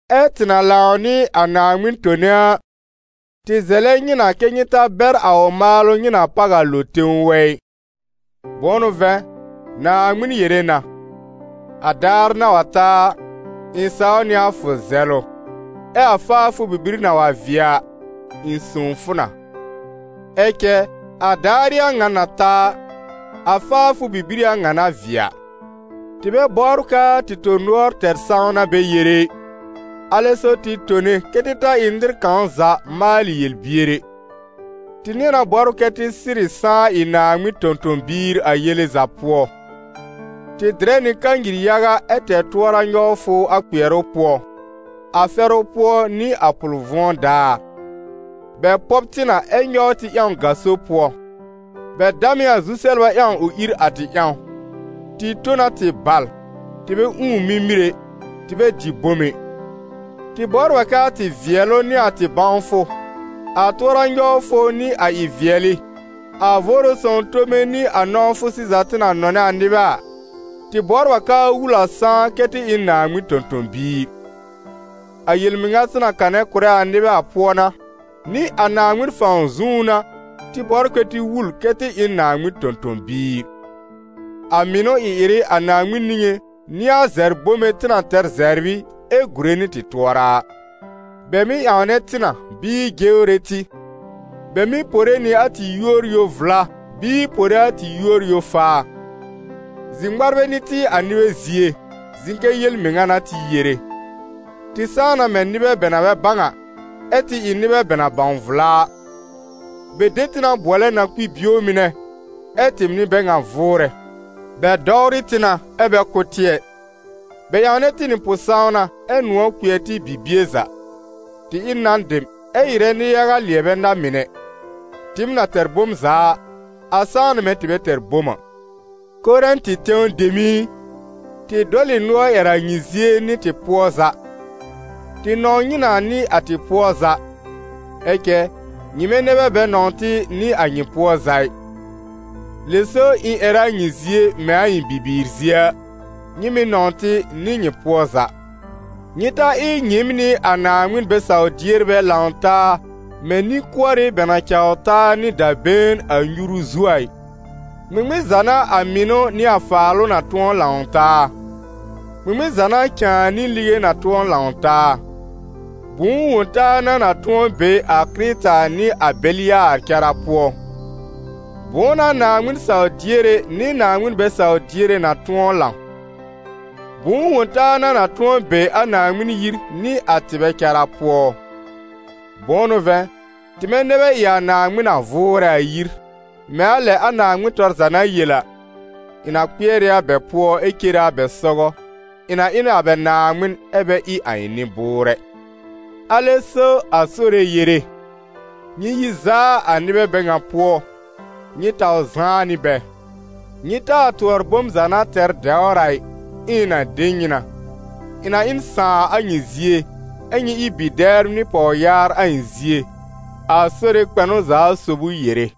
Ɛ tɩ na lãw nɩ a Naaŋmɩn tone a, tɩ zɛlɛ nyɩ na kɛ́ nyɩ ta bɛr a ʋ maalʋ nyɩ na páw a lo tẽw wɛ ɩ. Bʋ̃ʋ n'ʋ vɛ̃, Naaŋmɩn yere na: «A daar na wa ta a, ɩ̃ saw nɩ a fʋ zɛlʋ, ɛ a faafʋ bibir na wa vɩɛ a, ɩ̃ sõw fʋ na.» Ɛ cɛ a daar ɩ a ŋa na ta a, a faafʋ bibir ɩ a ŋa na vɩɛ a. Tɩ bɛ bɔbr k'aa tɩ tõ-nʋɔr tɛr sãwna bɛ yere ɩ, alɛ so tɩ tone kɛ́ tɩ ta ɩ nɩr kãw za maalɩ yel-bier ɛ. Tɩ nɩ̃ɛ na bɔbr kɛ tɩ sɩrɩ sãá ɩ Naaŋmɩn tõ-tõ-biir a yele za pʋɔ: tɩ dɩrɛ nɩ kanyir yaga ɛ tɛr tʋɔra-nyɔwfʋ a kpɩɛrʋ pʋɔ, a fɛrʋ pʋɔ nɩ a pʋl-vʋ̃ɔ daar. Bɛ pɔb tɩ na, ɛ nyɔw tɩ ƴãw gaso pʋɔ. Bɛ dam ɩ a zu-sɛbla ƴãw ʋ ìr a tɩ ƴãw, tɩ tõ na tɩ bal, tɩ bɛ ũù mimir ɛ, tɩ bɛ dɩ bom ɛ. Tɩ bɔbr a k'aa tɩ vɩɛlʋ nɩ a tɩ bãwfʋ, a tʋɔra-nyɔwfʋ nɩ a ɩ-vɩɛlɩ, a Vʋʋrʋ Sõw tome nɩ a nɔ̃wfʋ sɩza tɩ na nɔnɛ a nɩbɛ a, tɩ bɔbr a k'aa wul a sãá kɛ tɩ ɩ n Naaŋmɩn tõ-tõ-biir; a yel-mɩŋa tɩ na kanɛ kʋ̀rɛ a nɩbɛ a pʋɔ n'a, nɩ a Naaŋmɩn fãw zũú n'a tɩ bɔbr kɛ́ tɩ wul kɛ tɩ ɩ n Naaŋmɩn tõ-tõ-biir. A mɩnʋ ɩ-ɩrɩ a Naaŋmɩn niŋé n'ɩ a zɛbr bome tɩ na tɛr zɛbr ɩ, ɛ gùre nɩ tɩ tʋɔra a. Bɛ mɩ́ ƴãwnɛ tɩ na bɩɩ jewre tɩ, bɛ mɩ́ pore nɩ a tɩ yúor yo-vla bɩɩ pore a tɩ yúor yo-faa. Zir-ŋmarbɛ n'ɩ tɩ a nɩbɛ zie, zɩ̃ kɛ yel-mɩŋa n'a tɩ yere; tɩ sãá na mɛ̃ nɩbɛ bɛ na bɛ bãw a, ɛ́ tɩ ɩ nɩbɛ bɛ na bãw vla a; bɛ de tɩ na bʋɔlɛ na-kpi-bio mɩnɛ, ɛ́ tɩɩm n'ɩ bɛ ŋan vʋʋrɛ. Bɛ dɔwrɩ tɩ na, ɛ́ bɛ kʋ́ tɩ ɛ; bɛ ƴãwnɛ tɩ nɩ pʋ-sãwna, ɛ́ nʋ̃ɔ̀ kpɩɛr tɩ bibie za; tɩ ɩ n nan dem, ɛ́ ɩrɛ nɩ-yaga lɩɛbɛ na-mɩnɛ; tɩɩm na tɛr bom za a, a sãá na mɛ̃ tɩ bɛ tɛr bom a. Korɛ̃tɩ tẽw dem ɩ, tɩ dɔl ɩ nʋɔr ƴɛr a nyɩ zie nɩ tɩ pʋɔ za. Tɩ nɔ̃w nyɩ na nɩ a tɩ pʋɔ za, ɛ cɛ nyɩmɛ nɛ bɛ bɛ nɔ̃w tɩ nɩ a nyɩ pʋɔ za ɩ. Lɛ so ɩ̃ ƴɛrɛ a nyɩ zie mɛ̃ a ɩ̃ bibiir zie a: «Nyɩ mɩ̀ nɔ̃w tɩ nɩ nyɩ pʋɔ za.» Nyɩ ta ɩ nyɩɩm nɩ a Naaŋmɩn bɛ-saw-dierbɛ lãw taa mɛ̃ nĩ-kʋɔrɩ bɛ na caw taa nɩ da-been a nyuru zu a ɩ. Ŋmɩŋmɩn za n'a a mɩnʋ nɩ a faalʋ na tʋ̃ɔ lãw taa? Ŋmɩŋmɩn za n'a cãa nɩ lige na tʋ̃ɔ lãw taa? Bʋ̃ʋ wõ-taa n'a na tʋ̃ɔ be a Kɩrɩta nɩ a Belɩyaar cara pʋɔ? Bʋ̃ʋ n'a Naaŋmɩn saw-diere nɩ Naaŋmɩn bɛ-saw-diere na tʋ̃ɔ lãw? Bʋ̃ʋ wõ-taa n'a na tʋ̃ɔ be a Naaŋmɩn yir nɩ a tɩbɛ cara pʋɔ? Bʋ̃ʋ n'ʋ vɛ̃, tɩmɛ nɛ bɛ ɩ a Naaŋmɩn na vʋʋrɛ a yir, mɛ̃ a lɛ a Naaŋmɩn tɔr za na yel a: «Ɩ̃ na kpɩɛr ɩ a bɛ pʋɔ, ɛ́ cere a bɛ sɔgɔ, ɩ̃ na ɩ n a bɛ Naaŋmɩn, ɛ́ bɛ ɩ a ɩ̃ nɩ-bʋʋrɛ.» Alɛ so a Sore yere: «Nyɩ yi zaa a nɩbɛ bɛ ŋa pʋɔ, nyɩ taw zãá nɩ bɛ. Nyɩ taa tʋɔr bom za na tɛr dɛwr a ɩ, ɛ ɩ̃ na de nyɩ na. Ɩ̃ na ɩ n sãà a nyɩ zie, ɛ́ nyɩ ɩ bi-dɛbr nɩ pɔwyaar a ɩ̃ zie, a Sore kpɛnʋ-za-sob ʋ yere.»